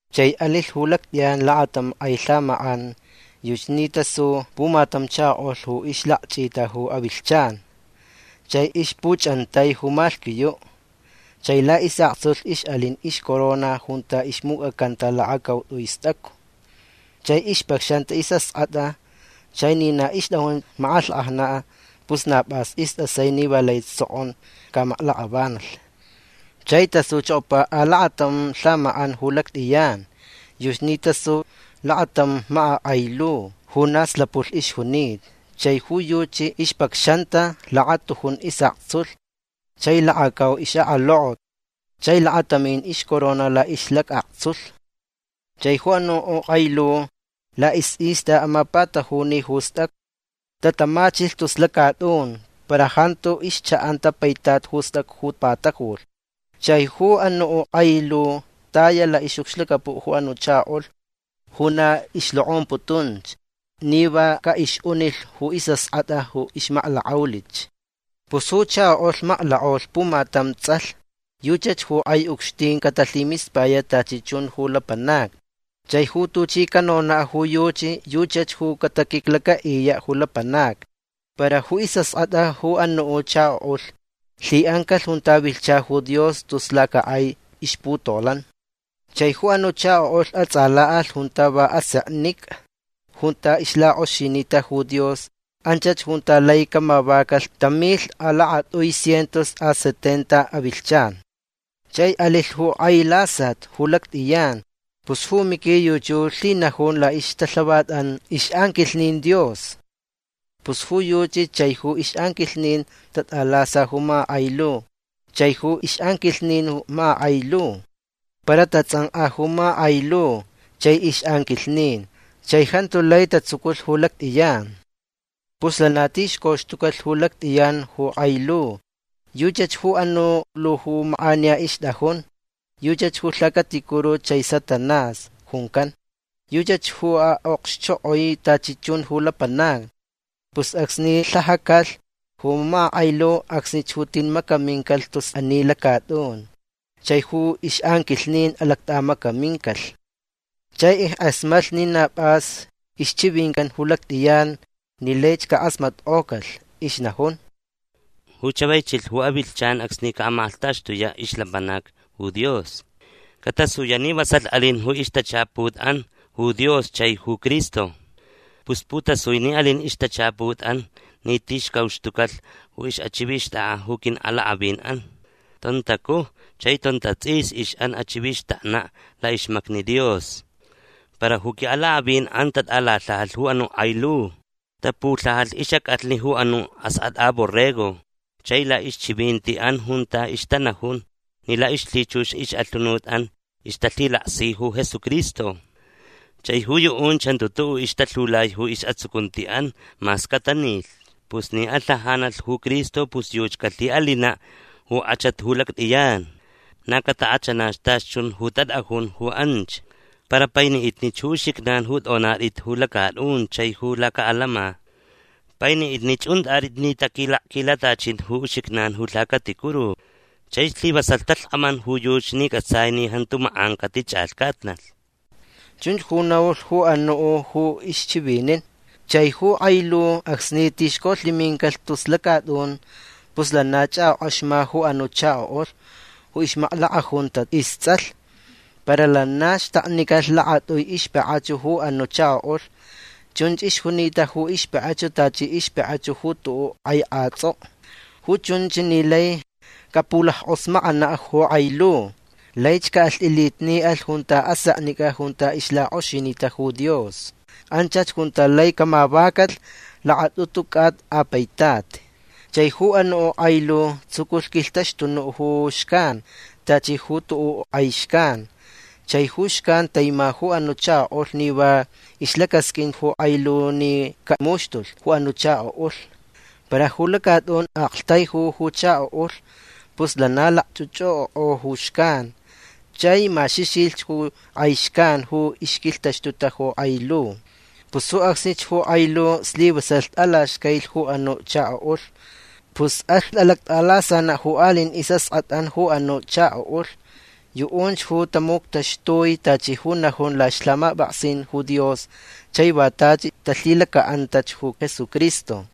Chai alilh ju lactʼiyan lakatam kʼai lhamakʼan. Yuchi ni tasu pumatam chakoʼulh ju ixlakchʼita ju avilhchan. Chai ixpuchʼantai ju malhquiyuʼ. Chai laʼisʼaktsulh ixʼalin ixcorona junta ixmucʼacanta lakacautʼui stʼacu. Chai ixpacxanta isʼaskʼatʼa. Chai ni na ixtʼajun makʼalhkʼajnaʼ pus na pʼas istʼasai ni va laich sokʼon camaklakʼavanalh. Chai tasuchokopa alakatam lhamakʼan ju lactʼiyan. Yuchi ni tasu lakatam makakʼai lu ju na slapulh ixjunita. Chai ju yuchi ixpacxanta lakatujun isʼaktsulh chai lakacau ixʼakalokot chai lakatamin ixcorona laʼixlacʼaktsulh. Chai ju anuʼ kʼai lu laʼisʼista amapatajuni ju stʼacu. Tatamachilh tus lacatʼun. Para jantu ixchaʼanta paitat ju stʼacu ju patajulh. Chai ju anuʼ kʼai lu taya laʼixʼucxlacapuʼ ju anuʼ chakoʼulh ju na ixlokʼomputunch ni va caʼixʼunilh ju isʼaskʼatʼa ju ixmaklakʼaulich. Pus ju chakoʼulh maklakʼaulh pumatam tsʼalh. Yuchach ju kʼai ucxtin catalhimispayaʼ tachi chun ju lapanacni. Chai ju tuchi canonaʼ ju yuchi yuchach ju cataquiclacaʼiyaʼ ju lapanacni. Para ju isʼaskʼatʼa ju anuʼ chakoʼulh lhiʼancalh junta vilhcha ju Dios tus lacakʼai ixputolan. Chai ju anuʼ chakoʼulh atsʼalaʼalh junta va aseknicʼa junta ixlakʼoxinita ju Dios. Anchach junta lai camavacalh tam milh a lakatʼui cientos a sesenta avilhchan. Chai alilh ju kʼai lasat ju lactʼiyan. Pus ju Miqui yuchi ju lhinajun laʼixtalhavatʼan ixʼanquilhnin Dios. Pus ju yuchi chai ju ixʼanquilhnin tatʼalasalh ju makakʼai lu chai ju ixʼanquilhnin ju makakʼai lu. Para tatsʼankʼa ju makakʼai lu chai ixʼanquilhnin. Chai jantu lai tatsuculh ju lactʼiyan. Pus lana tixcoxtucalh ju lactʼiyan ju kʼai lu. Yuchach ju anuʼ lu ju makʼaniya ixtʼajunch. Yuchach ju lhacaticuru chai Satanás juncan. Yuchach ju aʼokxchokʼoi tachi chun ju lapanacni. Pus acsni lhajacalh ju makakʼai lu acsnich ju tin macamincalh tus ani lacatʼun. Chai ju ixʼanquilhnin alactʼamacamincalh. Chai ickʼasmatlh ni na pʼas ixchivincan ju lactʼiyan ni laich cakʼasmatkʼocalh. Ixnajun: ―Ju chavai chilh ju avilhchan acsni caʼamakʼalhtaxtuyaʼ ixlapanacni ju Dios. Catasuyaʼ ni vasalh alin ju ixtachaputʼan ju Dios chai ju Cristo. Pus putasui ni alin ixtachaputʼan ni tixcauxtucalh ju ixʼachivixtʼakʼa ju quiʼalakʼavinʼan. Tontacuj chai tontatsʼis ixʼan achivixtaknaʼ laʼixmacni Dios. Para ju quiʼalakʼavinʼan tatʼalalhajalh ju anuʼ kʼai lu. Tapulhajalh ixʼacʼalhni ju anuʼ Askʼatʼa Borrego chai laʼixchivintiʼan junta ixtanajun ni laʼixlhichux ixʼalhunutʼan ixtalhilaksi ju Jesucristo. Chai ju yuʼunch jantu tuʼuʼ ixtalhiulai ju isʼatsucuntiʼan mas catanilhch. Pus ni alhajanalh ju Cristo pus yuchi calhiʼalinaʼ ju kʼachat ju lactʼiyan. Na catakʼachanach tachi chun ju tatʼajun ju anch. Para painiʼitnich ju uxijnan ju tʼonatʼit ju lacatʼun chai ju lacaʼalama. Painiʼitnich untʼatʼit ni taquilakquilatachin ju uxijnan ju lhacaticuru. Chai slivasalh talhkʼaman ju yuchi ni cʼatsai ni jantu makʼan catichʼalhcatnalh. ―Chunch ju naulh ju anuʼ ju ixchivinin. Chai ju kʼai lu acsni tixcolhimincalh tus lacatʼun pus lana chʼakʼokʼaxma ju anuʼ chakoʼulh ju ixmaklakʼajunta istsʼalh. Para lana xtaknicalh lakatʼui ixpakʼachu ju anuʼ chakoʼulh. Chunch ixjunita ju ixpakʼachu tachi ixpakʼachu ju kʼai kʼatsʼokʼo. Ju chunch ni lai capulackʼosmakʼanaʼ ju kʼai lu. Laich caʼalhtʼilitniʼalh junta aseknicʼa junta ixlakʼoxinita ju Dios. Anchach junta lai camavacalh lakatʼutu cʼata a paitat. Chai ju anuʼ kʼai lu tsuculh quilhtaxtunuʼ ju xcan tachi ju tuʼuʼ kʼai xcan. Chai ju xcan taima ju anuʼ chakoʼulh ni va ixlacasqʼuin ju kʼai lu ni camuxtulh ju anuʼ chakoʼulh. Para ju lacatʼun aktaijulh ju chakoʼulh. Pus lana lakchʼuchʼuʼokʼo ju xcan. Chai maxixilh ju kʼai xcan ju ixquilhtaxtuta ju kʼai lu. Pus ju acsnich ju kʼai lu slivasalh tʼalaxcailich ju anuʼ chakoʼulh. Pus alh alactʼalasanaʼ ju aliʼin isʼaskʼatʼan ju anuʼ chakoʼulh. Yuʼunch ju tamuctaxtui tachi ju najun laʼixlhamapʼaksin ju Dios chai va tachi talhilacaʼanta ju Jesucristo.